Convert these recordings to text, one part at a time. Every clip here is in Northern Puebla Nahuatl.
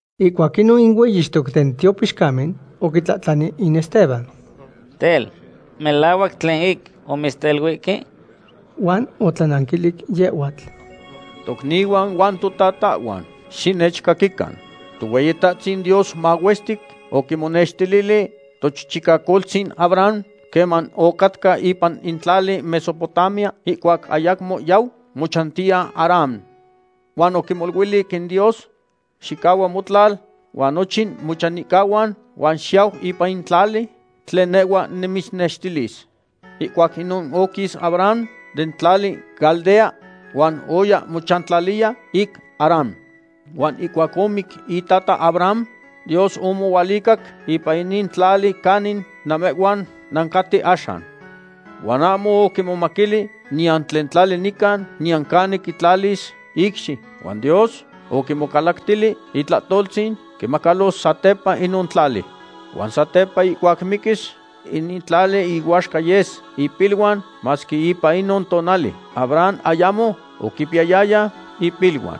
Ihcuac inon in hueyixtoc den tiopixcamen oquitlahtlani in Esteban: ―Tel, ¿melahuac tlen ic omitzteluihque? Huan otlananquilic yehhuatl: ―Tocnihuan huan totatahhuan, xinechcaquican. Tohueyitahtzin Dios mahuestic oquimonextilili tochichicacoltzin Abraham queman ocatca ipan tlali Mesopotamia, ihcuac ayamo yau mochantiya Harán. Huan oquimoluilic in Dios: “Xicahua motlal huan nochin mochanihcahuan, huan xiyau ipan in tlali tlen nehhua nimitznextilis.” Ihcuac inon oquis Abraham den tlali Caldea huan oya mochantlaliya ic Harán. Huan ihcuac omic itata Abraham, Dios omohualicac ipan inin tlali canin namehhuan nancaten axan. Huan ahmo oquimomaquili niyan tlen tlali nican, niyan canin quitlalis icxi, huan Dios oquimocalactili itlahtoltzin quimacalos satepa inon tlali. Huan satepa ihcuac miquis, inin tlali ihuaxca yes ipiluan, masque ipan inon tonali Abraham ayamo oquipiyayaya ipiluan.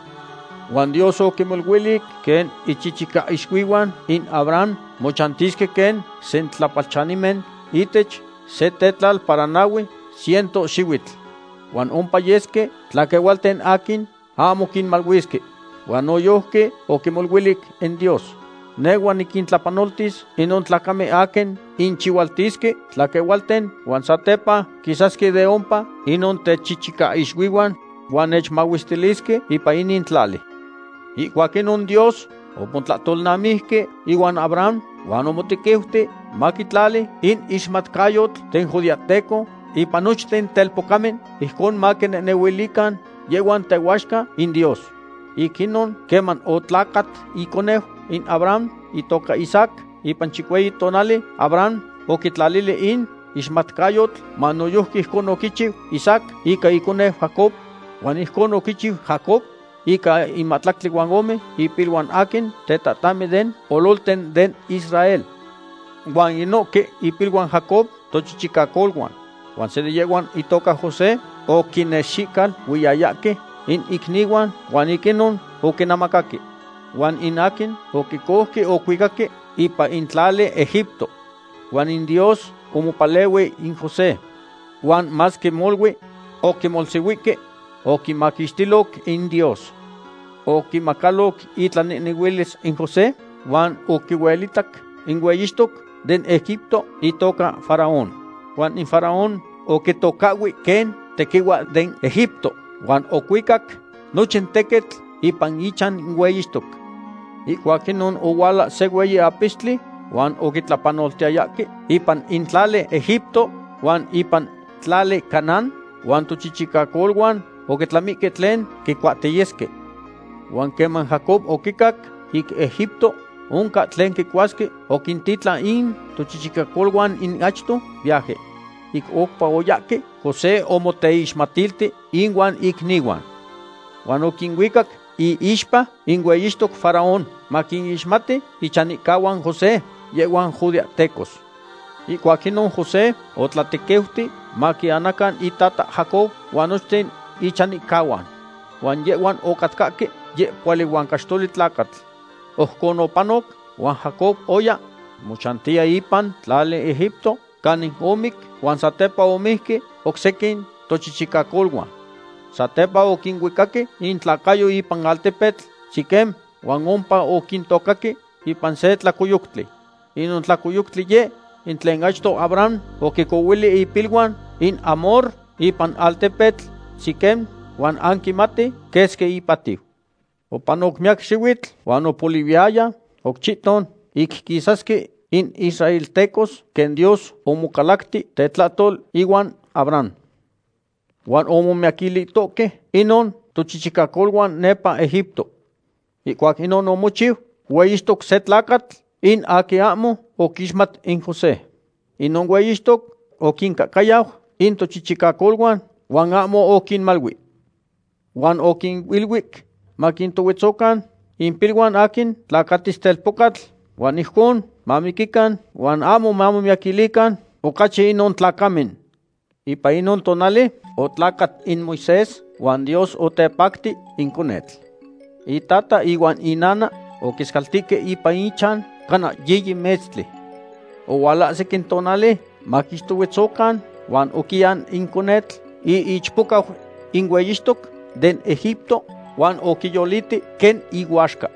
Huan Dios oquimoluilic quen ichichicaixuihuan in Abraham mochantisque quen sentlapalchanimen ihtech se tetlal para nahue ciento xihuitl. Huan ompa yesque tlaquehualten aquin ahmo quinmaluisque. Huan noyojqui oquimoluilic in Dios: “Nehhua niquintlapanoltis inon tlacamen aquin quinchihualtisque tlaquehualten, huan satepa quisasque de ompa inon techichicaixuihuan huan nechmahuestilisque ipan inin tlali.” Ihcuac inon Dios omotlahtolnamijque ihuan Abraham, huan omotequiuti maquitlali in ixmatcayotl den judeahteco ipan nochten telpocamen, ijcon maquinehnehuilican yehhuan tehuaxca in Dios. Ic inon, queman otlacat iconeu in Abraham itoca Isaac, ipan chicueyi tonali Abraham oquitlalili in ixmatcayotl huan noyojqui ijcon oquichiu Isaac ica iconeu Jacob, huan ojcon oquichiu Jacob ica in mahtlactli huan ome ipiluan aquin in tetatahmen den ololten den Israel. ’Huan inohque ipiluan Jacob tochichicacoluan. Huan se de yehhuan itoca José oquinexicaluiyayahque in icnihuan huan ic inon oquinemacaque. Huan in aquin oquicouque ocuicaque ipan in tlali Egipto. Huan in Dios omopalehui in José. Huan masque molui oquimohsihuihque, oquimaquixtiloc in Dios. Oquimacaloc itlanehnehuilis in José huan oquihuelitac in hueyixtoc den Egipto itoca Faraón. Huan in Faraón oquitocahhui quen tequihua den Egipto huan ocuicac nochin tequitl ipan ichan in hueyixtoc. ’Ihcuac inon ohuala se hueyi apistli huan oquitlapanoltiyayahque ipan in tlali Egipto huan ipan tlali Canaán, huan tochichicacoluan oquitlamihque tlen quicuahtiyesque. Huan queman Jacob oquicac ic Egipto oncan tlen quicuasque, oquintitlan in tochichicacoluan in achto viaje. Ic oupa oyahque, José omoteixmatilti ihuan icnihuan. Huan oquinuicac iixpa in hueyixtoc Faraón maquinixmati ichanihcahuan José yehhuan judeahtecos. Ihcuac inon José otlatequiuti maquianacan itata Jacob huan nochten ichanihcahuan. Huan yehhuan ocatcahque yehpohuali huan caxtoli tlacatl. Ojcon opanoc huan Jacob oya mochantiya ipan tlali Egipto, canin omic huan satepa omijque oc sequin tochichicacoluan. Satepa oquinuicaque intlacayo ipan in altepetl Siquem, huan ompa oquintocaque ipan se tlacoyoctli. Inon tlacoyoctli yeh in tlen achto Abraham oquicohuili ipiluan in Hamor ipan altepetl Siquem huan anquimati quesqui ipatiu. ’Opanoc miyac xihuitl huan opolihuiyaya oc chihton ic quisasque in israeltecos quen Dios omocalacti tetlahtol ihuan Abraham. Huan omomiyaquilihtohque inon tochichicacoluan nepa Egipto. Ihcuac inon omochiu hueyixtoc se tlacatl in aquin ahmo oquixmat in José. Inon hueyixtoc oquincahcayau in tochichicacoluan huan ahmo oquinmalui. Huan oquiniluic maquintohuetzocan impiluan aquin tlacatis telpocatl, huan ijcon mamiquican huan ahmo mamiyaquilican ocachi inon tlacamen. Ipan inon tonali otlacat in Moisés huan Dios otepacti in conetl. Itata ihuan inana oquiscaltihque ipan ichan cana yiyi metztli. Ohualahsic in tonali maquixtohuetzocan, huan oquian in conetl iichpocau in hueyixtoc den Egipto huan oquiyoliti quen ihuaxca.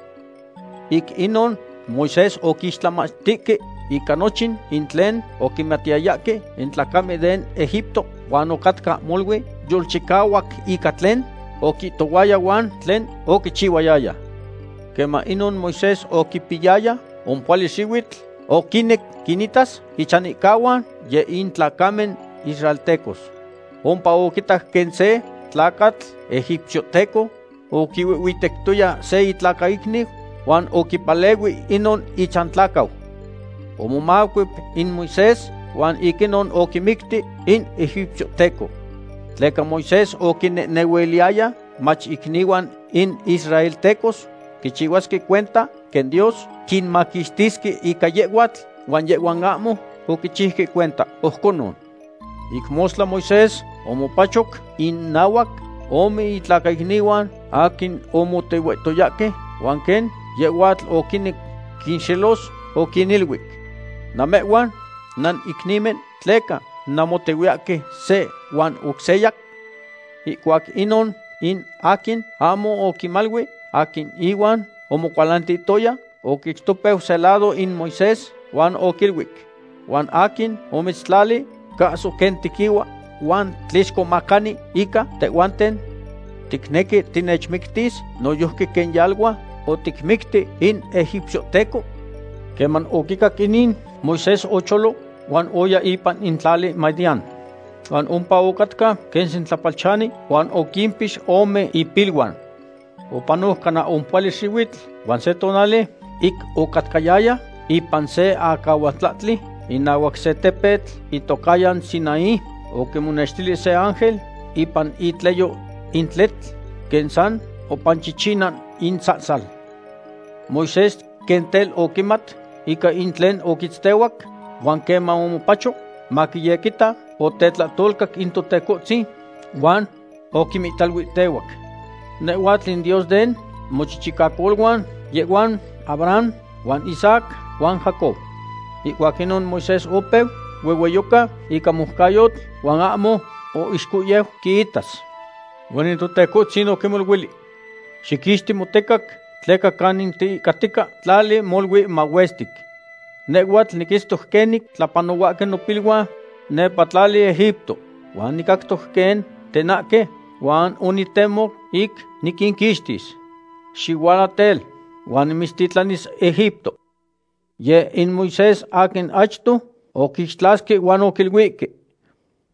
Ic inon, Moisés oquixtlamachtihque ica nochin in tlen oquimatiyayahque in tlacamen den Egipto, huan ocatca molui yolchicahuac ica tlen oquihtohuaya huan tlen oquichihuayaya. ’Queman inon Moisés oquipiyayaya ompohuali xihuitl, oquinec quinitas ichantlacahuan, yeh in tlacamen israeltecos. Ompa oquitac quen se tlacatl egipciohteco oquihuihhuitectoya se itlacaicniu, huan oquipalehui inon ichantlacau. Omomacuep in Moisés huan ic inon oquimicti in egipciohteco. Tleca Moisés oquinehnehuiliyaya mach icnihuan in israeltecos quichihuasque cuenta quen Dios quinmaquixtisque ica yehhuatl, huan yehhuan ahmo oquichiuque cuenta ojconon. Ic mostla Moisés omopachoc innahuac ome itlacaicnihuan aquin omotehuihtoyahque huan quen yehhuatl oquinec quinxelos, oquiniluic: “Namehhuan nanicnimen; ¿tleca nanmotehuiyahque se huan oc seya?” Ihcuac inon in aquin ahmo oquimalui aquin ihuan omocualantihtoya oquixtopeu se lado in Moisés huan oquiluic: “¿Huan aquin omitztlali cahso quen tequihua huan tlixcomacani ica tehhuanten? ¿Ticnequi tinechmictis noyojqui quen yalua oticmicti in egipciohteco?” Queman oquicac inin, Moisés ocholo huan oya ipan in tlali Madián. Huan ompa ocatca quen sentlapalchani, huan oquimpix ome ipiluan. ’Opanoc cana ompohuali xihuitl huan se tonali ic ocatcayaya ipan se acahualtlahtli inahuac se tepetl itocahyan Sinaí, oquimonextili se ángel ipan itleyo in tletl quen san opanchichina in sahsal. Moisés quen tel oquimat ica in tlen oquitztehuac huan queman omopacho maquiyequita, otetlahtolcac in Totecohtzin huan oquimihtaluihtehuac: “Nehhuatl in Dios den mochichicacoluan, yehhuan Abraham huan Isaac huan Jacob.” Ihcuac inon Moisés opeu huehueyoca ica moucayotl huan ahmo oixcohyeu quiitas. Huan in Totecohtzin oquimoluilic: “Xiquixti motecac tleca canin tiihcatica tlali molui mahuestic. Nehhuatl niquitztoc quenin tlapanohuahque nopiluan nepa tlali Egipto, huan nicactoc quen tenahque, huan onitemo ic niquinquixtis. Xihuala tel, huan nimitztitlanis Egipto.” ’Yeh in Moisés aquin achto oquixtlasque huan oquiluihque: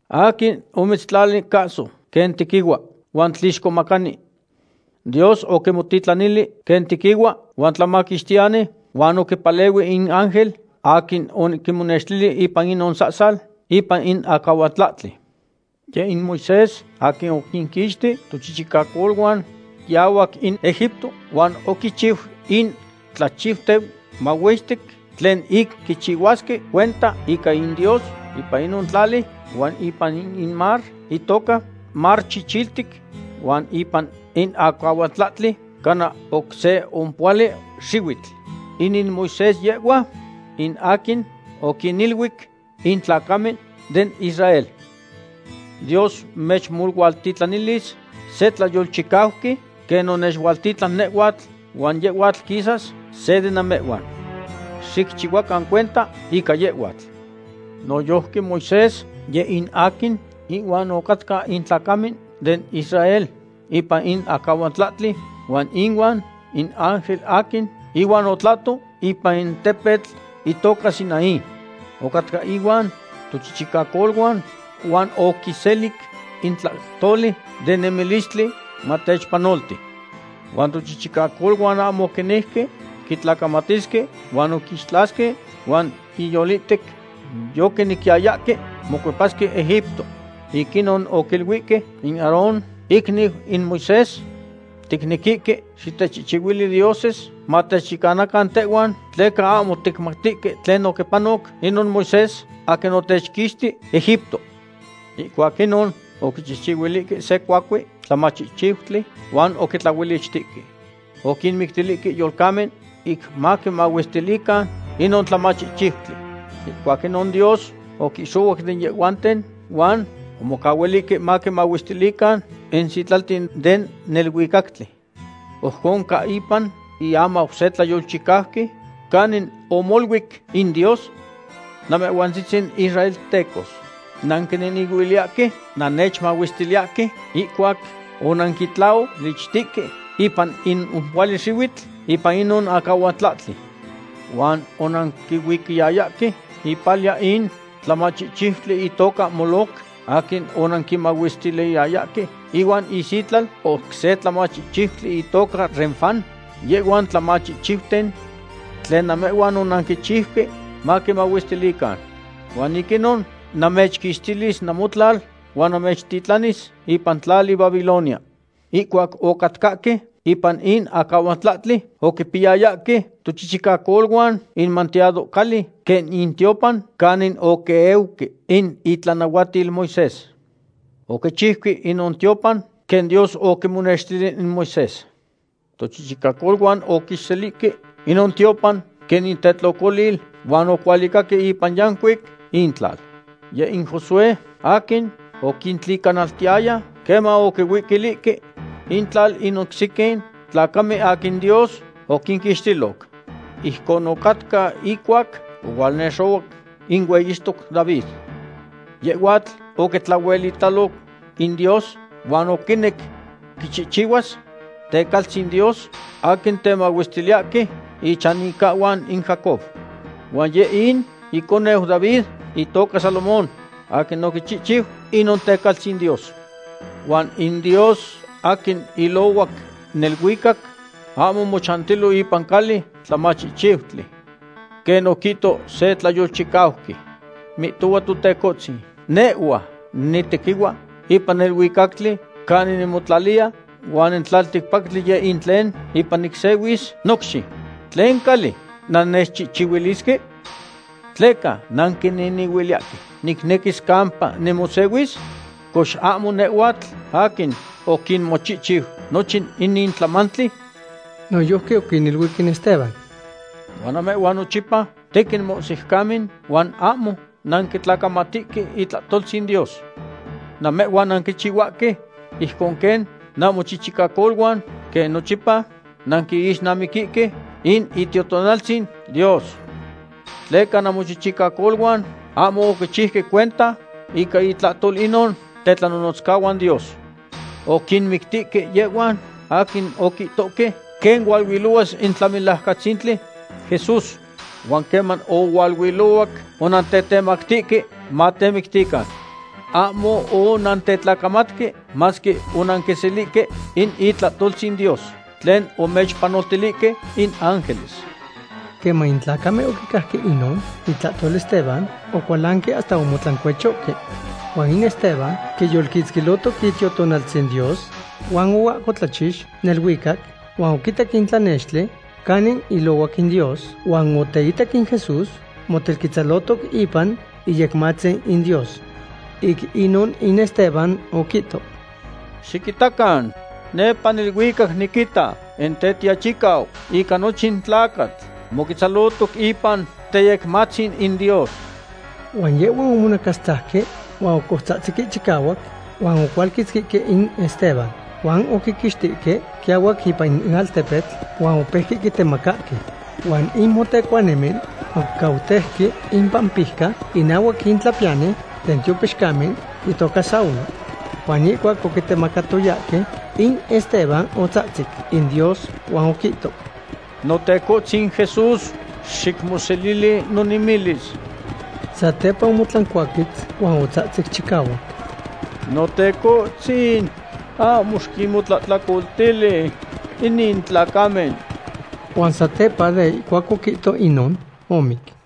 “¿Aquin omitztlali cahso quen tequihua huan tlixcomacani?” Dios oquimotitlanili quen tequihua huan tlamaquixtiyani huan oquipalehui in ángel aquin oquimonextili ipan inon sahsal ipan in acahualtlahtli. Yeh in Moisés aquin oquinquixti tochichicacoluan quiahuac in Egipto, huan oquichiu in tlachiuten mahuestic tlen ic quichihuasque cuenta ica in Dios ipan inon tlali, huan ipan in mar itoca Mar Chichiltic, huan ipan in acahualtlahtli cana oc se ompohuali xihuitl. Inin Moisés yehhua in aquin oquiniluic in tlacamen den Israel: “Dios mechmohualtitlanilis se tlayolchicauqui quen onechualtitlan nehhuatl, huan yehhuatl quisas se de namehhuan. Xicchihuacan cuenta ica yehhuatl.” Noyojqui Moisés yeh in aquin ihuan ocatca in tlacamen den Israel ipan in acahualtlahtli, huan ihuan in ángel aquin ihuan otlahto ipan in tepetl itoca Sinaí. Ocatca ihuan tochichicacoluan huan oquiselic in tlahtoli de nemilistli matechpanolti. ’Huan tochichicacoluan ahmo oquinejque quitlacamatisque, huan oquixtlasque huan inyolihtec yoquinequiyayahque mocuepasque Egipto. Ic inon oquiluihque in Aarón icniu in Moisés: “Ticnequihque xitechchihchihuili dioses matechyecanacan tehhuan, tleca ahmo ticmatihque tlen oquipanoc inon Moisés aquin otechquixti Egipto.” Ihcuac inon oquichihchihuilihque se cuacue tlamachihchiutli huan oquitlaolichtique. Oquinmictilihque yolcamen ic maquimahuestilican inon tlamachihchiutli. Ihcuac inon Dios oquixohuac den yehhuanten huan omocahuilihque maquimahuestilican in sitlalten den neluicactli. Ojcon ca ipan iamau se tlayolchicauqui canin omoluic in Dios: Namehhuantzitzin israeltecos, nanquinehnehuiliyahque nannechmahuestiliyahque ihcuac onanquitlaolichtihque ipan in ompohuali xihuitl ipan inon acahualtlahtli. Huan onanquihuicayayahque ipalia in tlamachihchiutli itoca Moloc, aquin onanquimahuestiliyayahque ihuan isitlal oc se tlamachihchiutli itoca Renfán, yehhuan tlamachihchiuten tlen namehhuan onanquichiuque maquimahuestilican. Huan ic inon namechquixtilis namotlal huan namechtitlanis ipan tlali Babilonia. ’Ihcuac ocatcahque ipan in acahualtlahtli oquipiyayahque tochichicacoluan in manteado cali quen in tiopan canin oquieuque in itlanahuatil Moisés. Oquichiuque inon tiopan quen Dios oquimonextili in Moisés. Tochichicacoluan oquiselihque inon tiopan quen intetlocolil huan ocualicaque ipan yancuic intlal. Yeh in Josué aquin oquintlicanaltiyaya queman oquincuilihque intlal in oc sequin tlacamen aquin Dios oquinquixtiloc. Ijcon ocatca ihcuac ohualnexohuac in hueyixtoc David. Yehhuatl oquitlahuelitalo in Dios huan oquinec quichihchihuas tecaltzin Dios aquin temahuestiliyahque ichanihcahuan in Jacob. Huan yeh in iconeu David itoca Salomón aquin oquichihchiu inon tecaltzin Dios. Huan in Dios aquin ilohuac neluicac ahmo mochantilo ipan cali tlamachihchiutli. Quen oquihto se tlayolchicauqui: Mihtohua Totecohtzin, Nehhua nitequihua ipan neluicatli canin nimotlaliya, huan in tlalticpactli yeh in tlen ipan nicsehuis nocxi. ¿Tlen cali nannechchihchihuilisque? ¿Tleca ticnehnehuiliyahque nicnequis campa nimosehuis? Cox, ¿ahmo nehhuatl aquin oquinmochihchiu nochin inin tlamantli? Noyojqui oquiniluic in Esteban: ―Huan namehhuan nochipa tequin mohsiucamen huan ahmo nanquitlacamatihque itlahtoltzin Dios. Namehhuan nanquichihuahque ijcon quen namochichicacoluan quen nochipa nanquixnamiquihque in Itiotonaltzin Dios. Tleca namochichicacoluan ahmo oquichiuque cuenta ica intlahtol inon tetlanonotzcahuan Dios. Oquinmictihque yehhuan aquin oquihtohque quen hualuilohuas in Tlamelajcatzintli Jesús, huan queman ohualuilohuac, onantetemactihque matemictican. Ahmo onantetlacamatque, masque onanquiselihque in itlahtoltzin Dios tlen omechpanoltilihque in ángeles. Queman in tlacamen oquicajque inon itlahtol Esteban, ocualanque hasta omotlancuechohque. Huan in Esteban quiyolquitzquihtoc Itiotonaltzin Dios, huan oahcotlachix neluicac huan oquitac in tlanextli canin ilohuac in Dios, huan oteitac in Jesús motelquetzalohtoc ipan iyecmatzin in Dios. Ic inon in Esteban oquihto: ―Xiquitacan, nepa neluicac niquita in Tetiachicau ica nochin tlacatl moquetzalohtoc ipan teyecmatzin in Dios. Huan yehhuan omonacastzajque huan ocoutzahtzihque chicahuac huan ocualquitzquihque in Esteban. Huan oquiquixtihque quiahuac ipan in altepetl huan opeuque quitemacahque. Huan in motencuanimen oquicautejque impampijca inahuac in tlahpiyani den tiopixcamen itoca Saulo. Huan ihcuac oquitemacatoyahque, in Esteban otzahtzic in Dios huan oquihto: ―Notecohtzin Jesús, xicmoselili nonemilis. Satepa omotlancuaquetz huan otzahtzic chicahuac: ―Notecohtzin, ahmo xiquinmotlahtlacoltili inin tlacamen. Huan satepa de ihcuac oquihto inon, omic.